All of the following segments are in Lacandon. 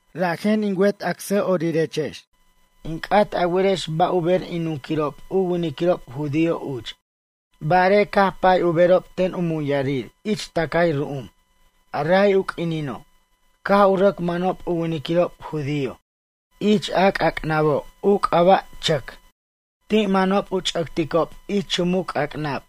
Rajen in wet acsa'orirex, in c'at a werex ba' u ber in nunquirob u winiquirob judío uch. Barej caj pay u berob ten u muyarir ich tʌcay ru'um. A ray u q'uinino', caj u rʌc manob u winiquirob judío ich a c'ac'nabo' u c'aba' chʌc. Ti' manob u ch'ʌcticob ich chumuc c'ac'nab.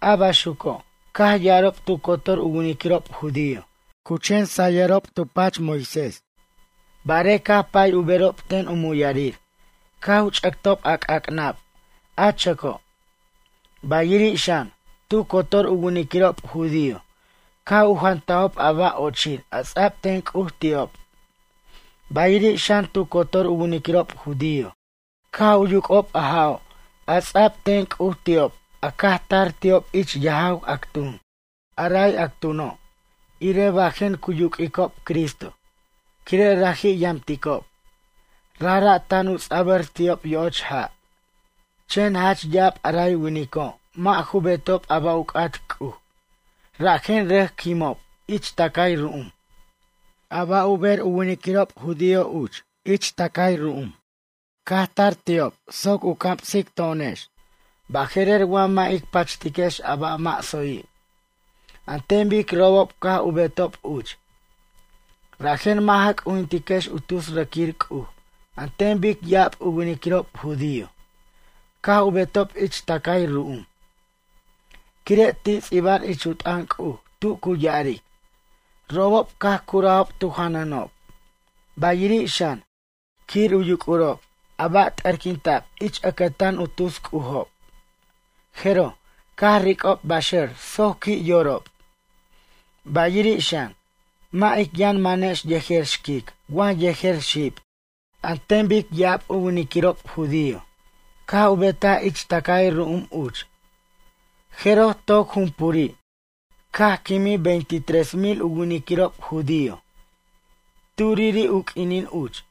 A baxuco', caj ya'arob tu cotor u winiquirob judío cu chen sayob tu pach Moisés, barej caj pay u berob ten u muyarir caj u ch'ʌctob a c'ac'nab a chʌco'. Bayiri' xan, tu cotor u winiquirob judío caj u jantajob a ba' ochir a ts'a'b ten C'uj ti'ob. Bayiri' xan, tu cotor u winiquirob judío caj u yuc'ob a ja'o' a ts'a'b ten C'uj ti'ob a caj tar ti'ob ich yajaw actun. A ray actuno', irej bajen cu yuq'uicob Cristo, quire' raji' yamticob, rajra' tan u ts'abʌr ti'ob yo'och ja'. Chen jach ya'ab a ray winico' mʌ' ju betob a ba' u c'at C'uj, rajen rʌc quimob ich tʌcay ru'um. A ba' u ber u winiquirob judío uch ich tʌcay ru'um, caj tar ti'ob soc u camsic to'onex baje'rer wa mʌ' ic pachtiquex a ba' mʌ' tsoyi', an ten bic robob caj u betob uch. Rajen mʌ' ja c'ujintiquex u tus rʌquir c'uj an ten bic ya'ab u winiquirob judío caj u betob ich tʌcay ru'um. Quire' ti' ts'iba'an ich u t'ʌn C'uj tu cu ya'aric: “Robob caj curajob tu janʌnob, bayiri' xan, quir u yuc'urob a ba' t'ʌrquinta'b ich ʌcʌtan u tus c'ujob. Jeroj, caj ric'ob baxʌr soc qui' yorob.” Bayiri' xan, mʌ' ic yʌn manex yejer xquic wa yejer xib, an ten bic ya'ab u winiquirob judío caj u betaj ich tʌcay ru'um uch. Jeroj toc jumpuri', caj quimij veinte tres mil u winiquirob judío turiri' u q'uinin uch.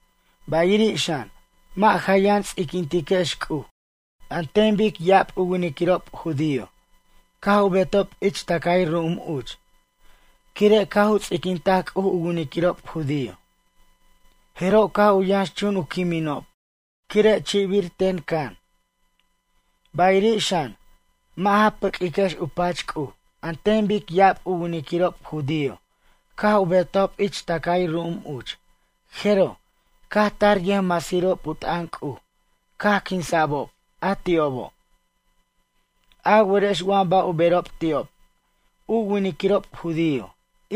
Bayiri' xan, mʌ' ja yʌn ts'iquintiquex C'uj an ten bic ya'ab u winiquirob judío caj u betob ich tʌcay ru'um uch. Quire' caj u ts'iquintaj C'uj u winiquirob judío, jeroj, caj u yʌnxchun u quiminob quire' chi'bir ten can. Bayiri' xan, mʌ' ja pʌq'uiquex u pach C'uj an ten bic ya'ab u winiquirob judío caj u betajob ich tʌcay ru'um uch, jeroj, caj tar u yʌjmasirob u t'ʌn C'uj caj quinsa'bob a ti'obo'. A werex wa ba' u berob ti'ob, u winiquirob judío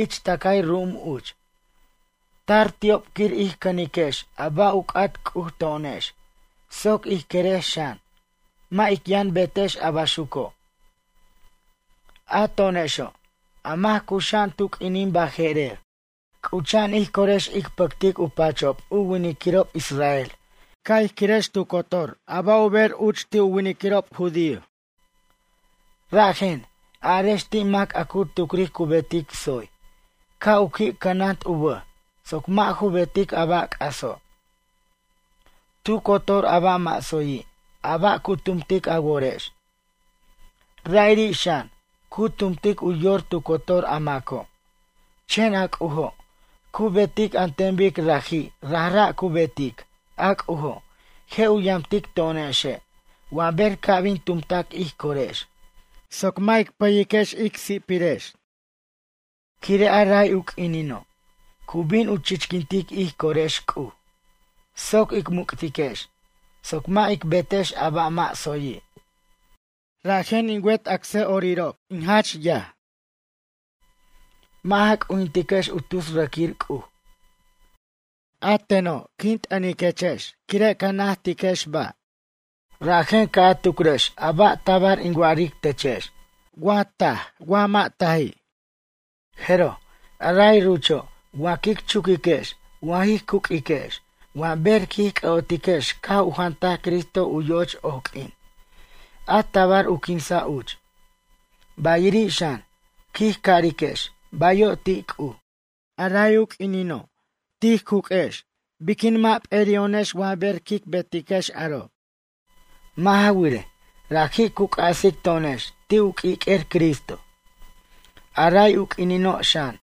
ich tʌcay ru'um uch, tar ti'ob quir ij cʌniquex a ba' u c'at C'uj to'onex, soc ij querex xan, mʌ' ic yʌn betex a baxuco'. A to'onexo', a mac cuxa'an tu q'uinin baje'rer, c'ucha'an ij corex ic pʌctic u pachob u winiquirob israel ca' ij quirex tu cotor a ba' u ber uch ti' u winiquirob judío. Rajen, arex ti' mac a cu tucric cu betic tsoy, ca' u qui' cʌnant u bʌj soc mʌ' ju betic a ba' c'aso'. Tu cotor a ba' mʌ' tsoyi', a ba' cu tumtic a worex. Ra'iri' xan, cu tumtic u yor tu cotor a maco'. Chen a C'ujo', cu betic an ten bic raji' rajra' cu betic, a C'ujo' je' u yamtic to'onexe' wa ber ca' bin tumtac ij corex soc mʌ' ic pʌyej ic si'pirex. Quire' a ray u quinino', cu bin u chichquintic ij corex C'uj, soc ic muc'tiquex, soc mʌ' ic betex a ba' mʌ' tsoyi'. Rajen in wet acsa'orirex in jach yaj, mʌ' ja c'ujintiquex u tus rʌquir c'uj. A teno', quin t'ʌniquex quire' ca najtiquex ba'. Rajen ca' a tucrex ba' tabar in wa'aric techex, wa taj wa mʌ' taji'. Jeroj, a ray rucho' wa quic chuquiquex wa jij cuq'uiquex wa ber quij c'ʌ'otiquex caj u jantaj Cristo u yo'och oq'uin, a tabar u quinsa' uch. Bayiri' xan, quij cariquex bayo' ti' C'uj. A ray u q'uinino' quij cuq'uex biquin, mʌ' p'eri'o'nex wa ber quic betiquex aro'? Mʌ' ja wirej, raji' cu c'asic to'onex ti' u q'uiq'uer Cristo. A ray u q'uinino' xan,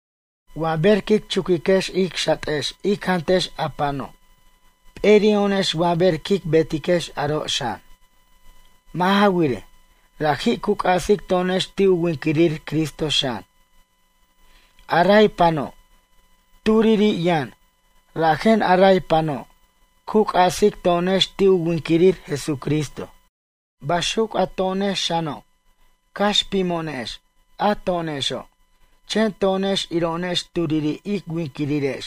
wa ber quic chuquiquex ic xatex ic jantex a pano', p'eri'o'onex wa ber quic betiquex aro' xan. Mʌ' ja wirej, raji' cu c'asic to'onex ti' u winquirir Cristo xan. A ray pano', turiri' yʌn, rajen a ray pano' cu c'asic to'onex ti' u winquirir Jesucristo. Baxuc a to'onex xano', cax pimo'onex a to'onexo', chen to'onex iro'onex turiri' ic winquirirex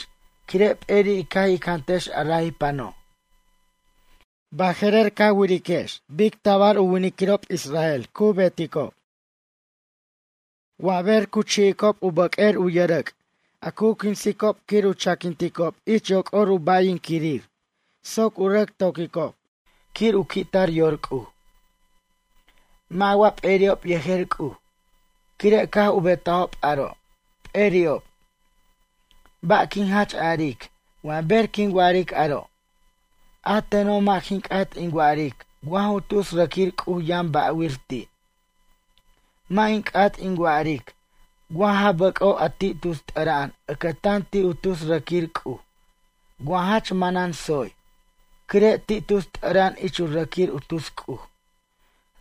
quire' p'eri' caj ic jantex a ray pano'. Baje'rer iriquex bic tabar u winiquirob israel cu beticob. Wa ber cu chi'icob u bʌq'uer u yʌrʌc' a cu quinsicob quir u chaquinticob ich yoc'or u ba'yirinquirir soc u rʌc to'quicob, quir u qui'tar yor C'uj. Mʌ' wa p'eri'ob yejer C'uj, quire' caj u betajob aro'? P'eri'ob. Ba' quin jach aric wa ber quin wa'aric aro', a teno' mʌ' jin c'at in wa'aric wa ju tus rʌquir c'uj yʌn ba'wir ti'. Mʌ' in c'at in wa'aric wa ja bʌc'o' a ti' tus t'ʌra'an ʌcʌtan ti' u tus rʌquir c'uj wa jach manan tsoy, quire' ti' tus t'ʌra'an ich u rʌquir u tus c'uj,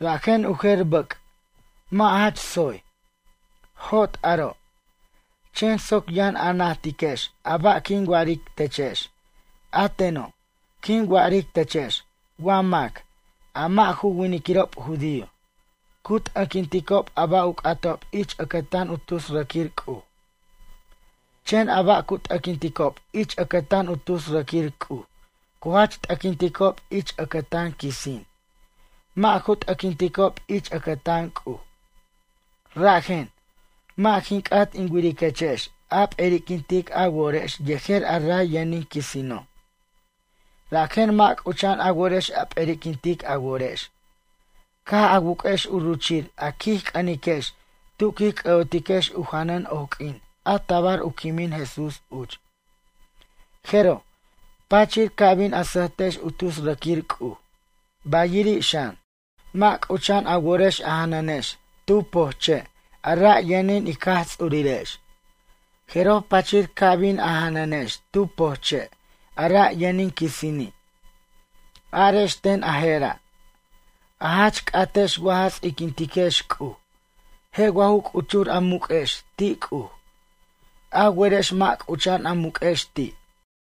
rajen u jer bʌc' mʌ' jach tsoy. Jot aro'. Chen soc a yʌn najtiquex a ba' quin wa'aric techex, a teno', quin wa'aric techex wa mac, a mʌ' ju winiquirob judío, cu t'ʌquinticob a ba' u c'atob ich ʌcʌtan u tus rʌquir c'uj. Chen a ba' cu t'ʌquinticob ich ʌcʌtan u tus rʌquir c'uj cu jach t'ʌquinticob ich ʌcʌtan quisin, mʌ' ju t'ʌquinticob ich ʌcʌtan C'uj. Rajen, mʌ' jin c'at in wiriquechex a p'eriquintic a worex yejer a ra' yʌnin quisino'. Rajen mʌ' c'ucha'an a worex a p'eriquintic a worex, caj a wuq'uex u ruchir a quij c'ʌniquex tu quij c'ʌ'otiquex u janʌn oq'uin a tabar u quimin Jesús uch. Jeroj, pachir ca bin a sʌjtex u tus rʌquir c'uj. Bayiri' xan, mʌ' c'ucha'an a worex a janʌnex tu pojche' a ra' yʌnin ic Jaj Ts'urirex, jeroj pachir ca bin a janʌnex tu pojche' a ra' yʌnin quisini'. Arex ten a jera'. A jach c'atex wa ja ts'iquintiquex C'uj? Je' wa ja c'uchur a muq'uex ti' C'uj? A werex mʌ' c'ucha'an a muq'uex ti'.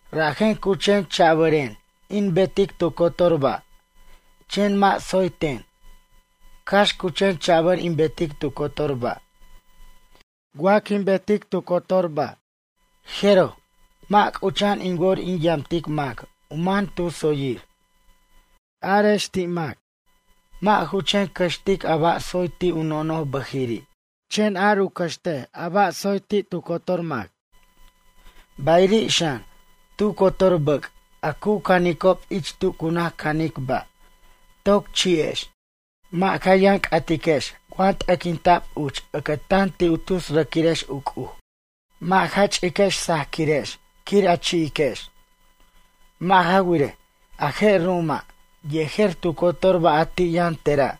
Rajen cu chen cha'bʌren in betic tu cotor ba', chen mʌ' tsoy ten, cax cu chen cha'bʌr in betic tu cotor ba'. Wa quin betic tu cotor a ba', jeroj, mʌ' c'ucha'an in wor in yamtic mac u man tu tsoyir. Arex ti' mac, mʌ' ju chen cʌxtic a ba' tsoy ti' u nonoj bʌjiri', chen ar u cʌxt a ba' tsoy ti' tu cotor mac. Bayiri' xan, tu cotor bʌc' a cu canicob ich tu cu naj canic ba', toc chi'ex. Mʌ' ja yʌn c'atiquex wa t'ʌquinta'b uch ʌcʌtan ti' u tus rʌquirex u c'uj. Mʌ' ja ch'iquex sajquirex quir a chi'iquex. Mʌ' ja wirej, a je' ru'uma', yejer tu cotor ba' a ti' yʌn tera',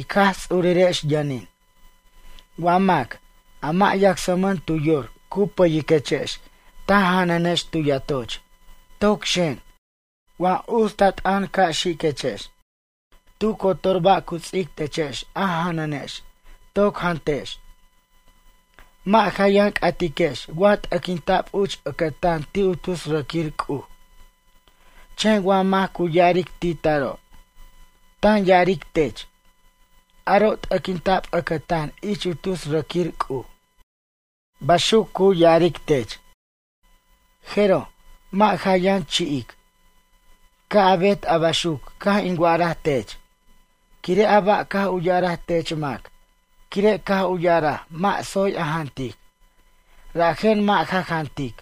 ic Jaj Ts'urirex yʌnin. Wa mac, a mʌ' yacsmʌn tu yor cu pʌyiquechex ta janʌnex tu yatoch, toc xen, wa uts ta t'ʌn ca' xiquechex. Tu cotor ba' cu ts'ic techex a janʌnex, toc jantex. Mʌ' ja yʌn c'atiquex wa t'ʌquinta'b uch ʌcʌtan ti' u tus rʌquir c'uj. Chen wa mac cu ya'aric ti' taro', tan ya'aric tech: “Aro' t'ʌquinta'b ʌcʌtan ich u tus rʌquir c'uj.” Baxuc cu ya'aric tech. Jeroj, mʌ' ja yʌn chi'ic. Ca' a bet a baxuc caj in wa'araj tech, quire' a ba' caj u ya'araj tech mac, quire' caj u ya'araj mʌ' tsoy a jantic, rajen mʌ' ja jantic.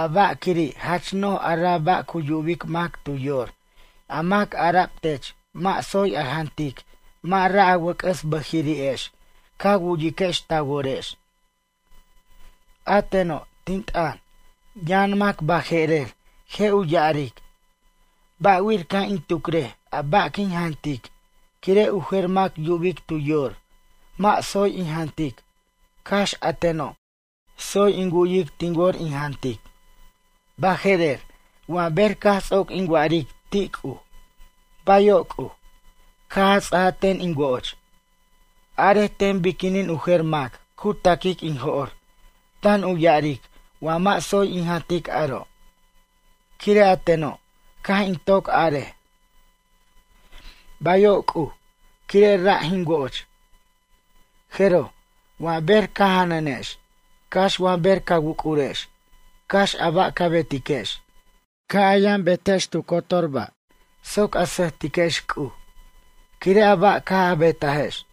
A ba' quiri' jach noj a ra' ba' cu yubic mac tu yor, a mac ara'b tech mʌ' tsoy a jantic mʌ' ra' a wʌc'ʌs bʌjiri'ex ca wu'yiquex ta worex. A teno', tin t'ʌn, yʌn mac baje'rer je' u ya'aric: “Ba'wir ca' in tucrej a ba' quin jantic quire' u jer mac yubic tu yor, mʌ' tsoy in jantic, cax a teno', tsoy in wu'yic tin wor in jantic. Baje'rer, wa ber caj ts'oc in wa'aric ti' C'uj: Bayo' C'uj, caj a ts'aj ten in wo'och. Arej ten biquinin u jer mac cu ta'quic in jo'r, tan u ya'aric wa mʌ' tsoy in jantic aro'. Quire' a teno', caj in toc arej: Bayo' C'uj', quire' ra' jin wo'och.” Jeroj, wa ber ca janʌnex, cax wa ber ca wuc'urex, cax a ba' ca betiquex, ca' a yʌn betex tu cotor ba' soc a sʌjtiquex C'uj, quire' a ba' caj a betajex.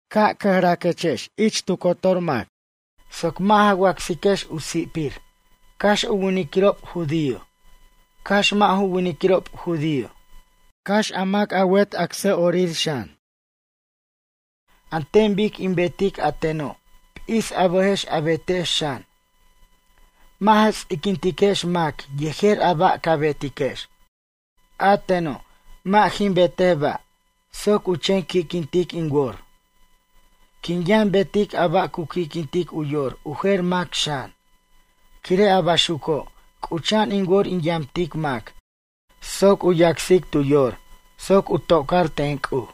Ca' cʌjraquex ich tu cotor mac, soc mʌ' ja wacsiquex u si'pir, cax u winiquirob judío, cax mʌ' ju winiquirob judío, cax a mac a wet acsa'orir xan. An ten bic in betic a teno', p'is a bʌjex a betex xan. Mʌ' ja ts'iquintiquex mac yejer a ba' ca betiquex. A teno', mʌ' jin betej ba' soc u chen qui'quintic in wor. Quin yʌn betic a ba' cu qui'quintic u yor u jer mac xan. Quire' a baxuco', c'ucha'an in wor in yamtic mac soc u yacsic tu yor soc u to'car ten C'uj.